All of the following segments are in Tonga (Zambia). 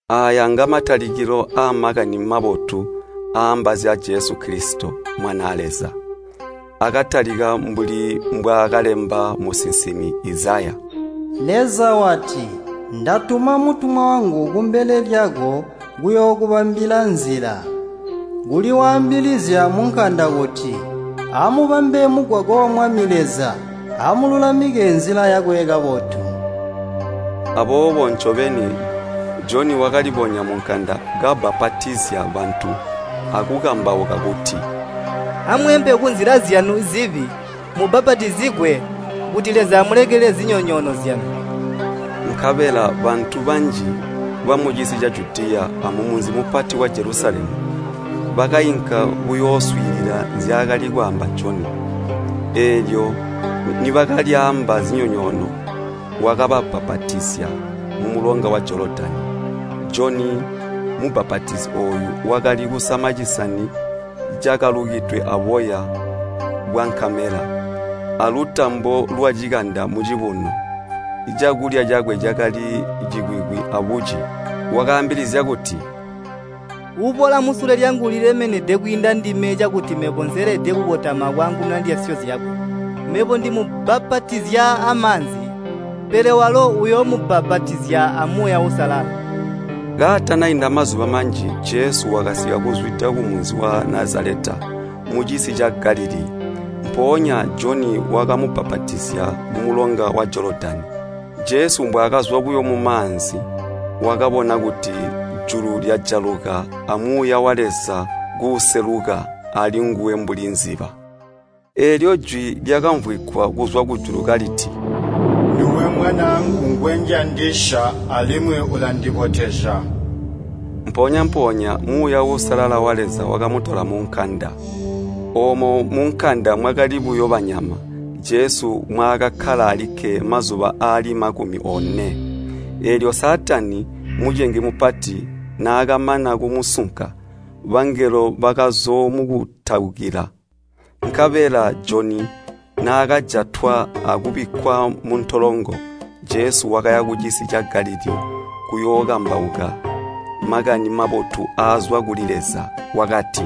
Aaya nga Makani Mabotu aaamba zya Jesu Kilisito, Mwanaa Leza. Akatalika mbuli mbwaakalemba musinsimi Izaya: “Leza wati, ‘Ndatuma mutumwa wangu kumbele lyako kuyookubambila nzila.’ Kuli waambilizya munkanda kuti, ‘Amubambe mugwagwa wa Mwami Leza! Amululamike nzila yakwe kabotu!’” Aboobo ncobeni Joni wakalibonya munkanda kabbapatizya bantu akukambauka kuti, “Amweempe kunzila zyanu zibi, mubbapatizigwe, kuti Leza amulekelele zinyonyoono zyanu.” Nkabela bantu banji bamucisi ca Judiya amumunzi mupati wa Jelusalemu, bakainka kuyooswiilila nzyaakali kwaamba Joni. Eelyo nibakalyaamba zinyoonyono wakababbapatizya mumulonga wa Jolodani. Joni Mubbapatizi ooyu wakali kusama cisani cakalukidwe aboya bwankamela, alutambo lwacikanda mucibuno. Cakulya cakwe cakali cikwikwi abuci. Wakaambilizya kuti, “Uuboola musule lyangu ulilemenede kwiinda ndime cakuti mebo nseelede kukotama akwaangununa ndyasyo zyakwe. Mebo ndimubbapatizya amaanzi, pele walo uyoomubbapatizya a Muuya Uusalala.” Kaatanainda mazuba manji Jesu wakasika kuzwida kumunzi wa Nazaleta, mucisi ca Galilii, mpoonya Joni wakamubbapatizya mumulonga wa Jolodani. Jesu mbwaakazwa buyo mumaanzi, wakabona kuti julu lyajaluka a Muuya wa Leza kuuseluka alinguwe mbuli nkwilimba. Eelyo jwi lyakamvwigwa kuzwa kujulu kaliti, “Nduwe Mwanaangu ngwenjandisya, alimwi ulandibotezya.” Mpoonya-mpoonya Muuya Uusalala wa Leza wakamutola munkanda. Oomo munkanda mwakali buyo banyama, Jesu mwaakakkala alikke mazuba aali makumi one. Eelyo Saatani, mucengi mupati, naakamana kumusunka, bangelo bakazoomukutaukila. Nkabela Joni naakajatwa akubikkwa muntolongo, Jesu wakaya kucisi ca Galilii kuyookambauka Makani Mabotu aazwa kuli Leza. Wakati,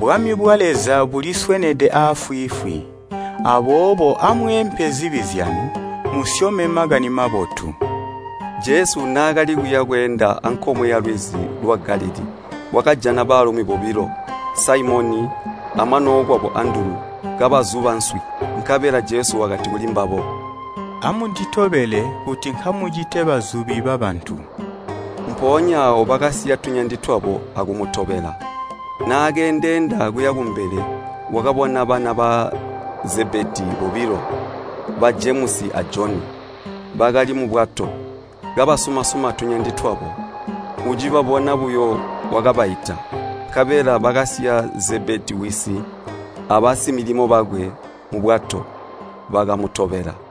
“Bwami bwa Leza buliswenede aafwiifwi! Aboobo amweempe zibi zyanu, musyome Makani Mabotu.” Jesu naakali kuya bweenda ankomwe yalwizi lwa Galilii, wakajana baalumi bobilo, Saimoni amwanookwabo Andulu, kabazuba nswi. Nkabela Jesu wakati kulimbabo, “Amunditobele, kuti nkamucite bazubi babantu.” Mpoonya aawo bakasiya tunyandi twabo akumutobela. Naakeendeenda kuya kumbele, wakabona bana ba Zebedii bobilo, ba Jemusi a Joni. Bakali mubwato, kabasuma-suma tunyandi twabo. Ucibabona buyo wakabaita. Nkabela bakasiya Zebedii wisi abasimilimo bakwe mubwato, bakamutobela.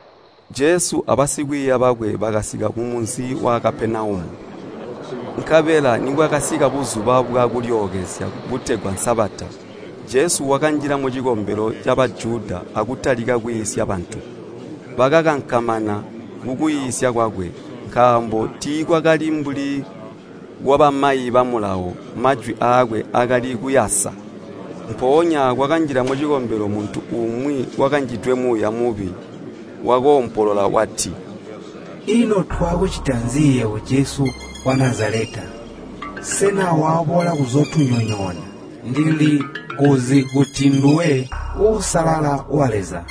Jesu abasikwiiya bakwe bakasika kumunzi wa Kapenaumu, nkabela nibwakasika Buzuba bwa Kulyookezya butegwa Sabata, Jesu wakanjila mucikombelo ca Bajuda akutalika kwiisya bantu. Bakakankamana kukwiisya kwakwe, nkaambo tiikwakali mbuli kwabamayi ba Mulawo, majwi aakwe akali kuyasa. Mpoonya kwakanjila mucikombelo muntu umwi wakanjidwe muuya mubi, wakoompolola wati, “Ino twakucita nzi yebo Jesu wa Nazaleta? Sena waboola kuzootunyonyoona? Ndilikuzi kuti nduwe Uusalala wa Leza!”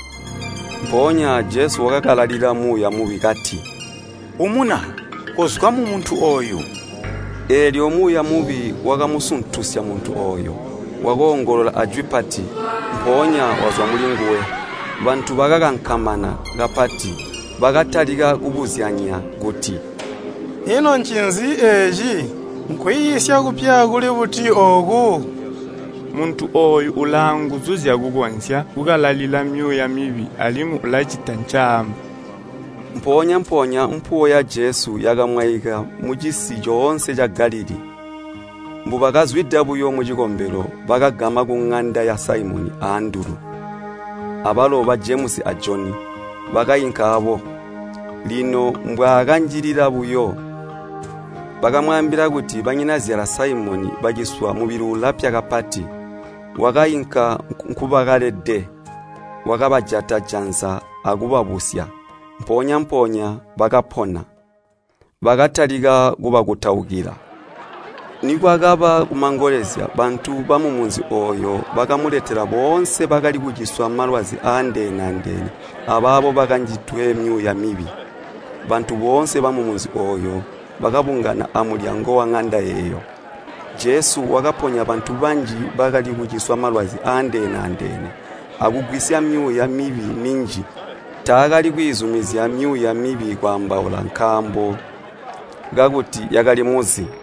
Mpoonya Jesu wakakalalila muuya mubi kati, “Umuna, kozwa mumuntu ooyu!” Eelyo muuya mubi wakamusuntusya muntu ooyo. Wakoongolola ajwi pati, mpoonya wazwa mulinguwe. Bantu bakagambwa kapati, bakatalika kubuzyanya kuti, “Ino ncinzi eeci? Nkwiisya kupya kuli buti ooku? Muntu ooyu ulaanguzu zyakukonzya kukalalila myuuya mibi alimwi ilacita ncaamba!” Mpoonya-mpoonya mpuwo ya Jesu yakamwaika mucisi coonse ca Galilii. Mbubakazwida buyo mucikombelo bakagama kuŋanda ya Saimoni a Andulu, abalo ba Jemusi a Joni bakainka aabo. Lino mbwaakanjilila buyo, bakamwaambila kuti banyinazyala Saimoni baciswa mubili ulapya kapati. Wakainka nkubakalede. Wakabajata janza akubabusya, mpoonya-mpoonya bakapona, bakatalika kubakutaukila. Nikwakaba kumangolezya, bantu bamumunzi ooyo bakamuletela boonse bakali kuciswa malwazi aandeene-andeene abaabo bakanjidwe myuuya mibi. Bantu boonse bamumunzi ooyo bakabungana amulyango waŋanda eeyo. Jesu wakaponya bantu banji bakali kuciswa malwazi aandeene-andeene, akugwisya myuuya mibi minji. Taakali kwiizumizya myuuya mibi kwaambaula nkaambo kakuti yakalimuzi.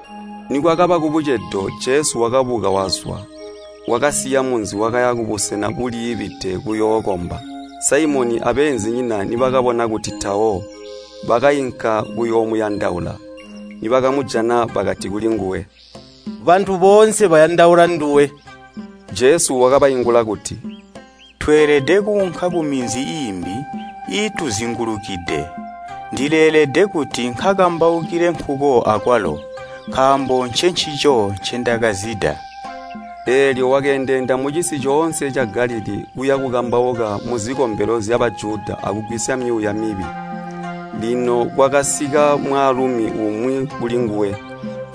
Nikwakaba kubucedo Jesu wakabuka wazwa. Wakasiya munzi wakaya kubusena buliibide kuyookomba. Saimoni abeenzinyina nibakabona kuti tawo, bakainka kuyoomuyandaula. Nibakamujana, bakati kulinguwe, “Bantu boonse bayandaula nduwe.” Jesu wakabaingula kuti, “Tweelede kuunka kuminzi iimbi iituzingulukide. Ndileelede kuti nkakambaukile nkuko akwalo, nkaambo ncencico ncendakazida.” Eelyo wakeendeenda mucisi coonse ca Galilii kuya bukambauka muzikombelo zya Bajuda akugwisya myuuya mibi. Lino kwakasika mwaalumi umwi kulinguwe,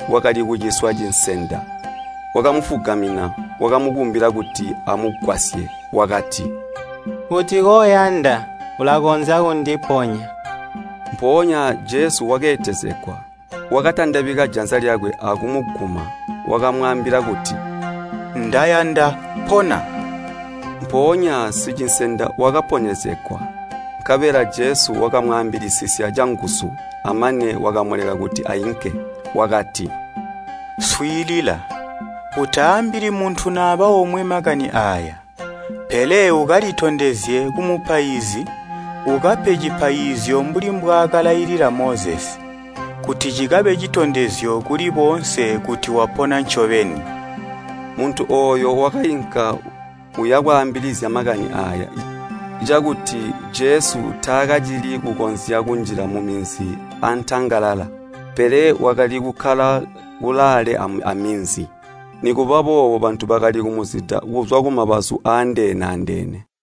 wakali kuciswa cinsenda. Wakamufugamina wamukumbila kuti amugwasye. Wakati, “Kuti koyanda, ulakonzya kundiponya.” Mpoonya Jesu wakeetezegwa. Wakatandabika janza lyakwe akumuguma, wakamwaambila kuti, “Ndayanda, pona.” Mpoonya sicinsenda wakaponyezegwa. Nkabela Jesu wakamwaambilisisya canguzu, amane wakamuleka kuti ainke. Wakati, “Swiilila, utaambili muntu naba omwe makani aaya, pele ukalitondezye kumupaizi, ukape cipaizyo mbuli mbwaakalailila Mozesi, kuti cikabe citondezyo kuli boonse kuti wapona ncobeni.” Muntu ooyo wakainka uya bwaambilizya makani aaya, cakuti Jesu taakacili kukonzya kunjila muminzi antangalala. Pele wakali kukkala kulaale aminzi. Nikuba boobo bantu bakali kumuzida kuzwa kumabazu aandeene-andeene.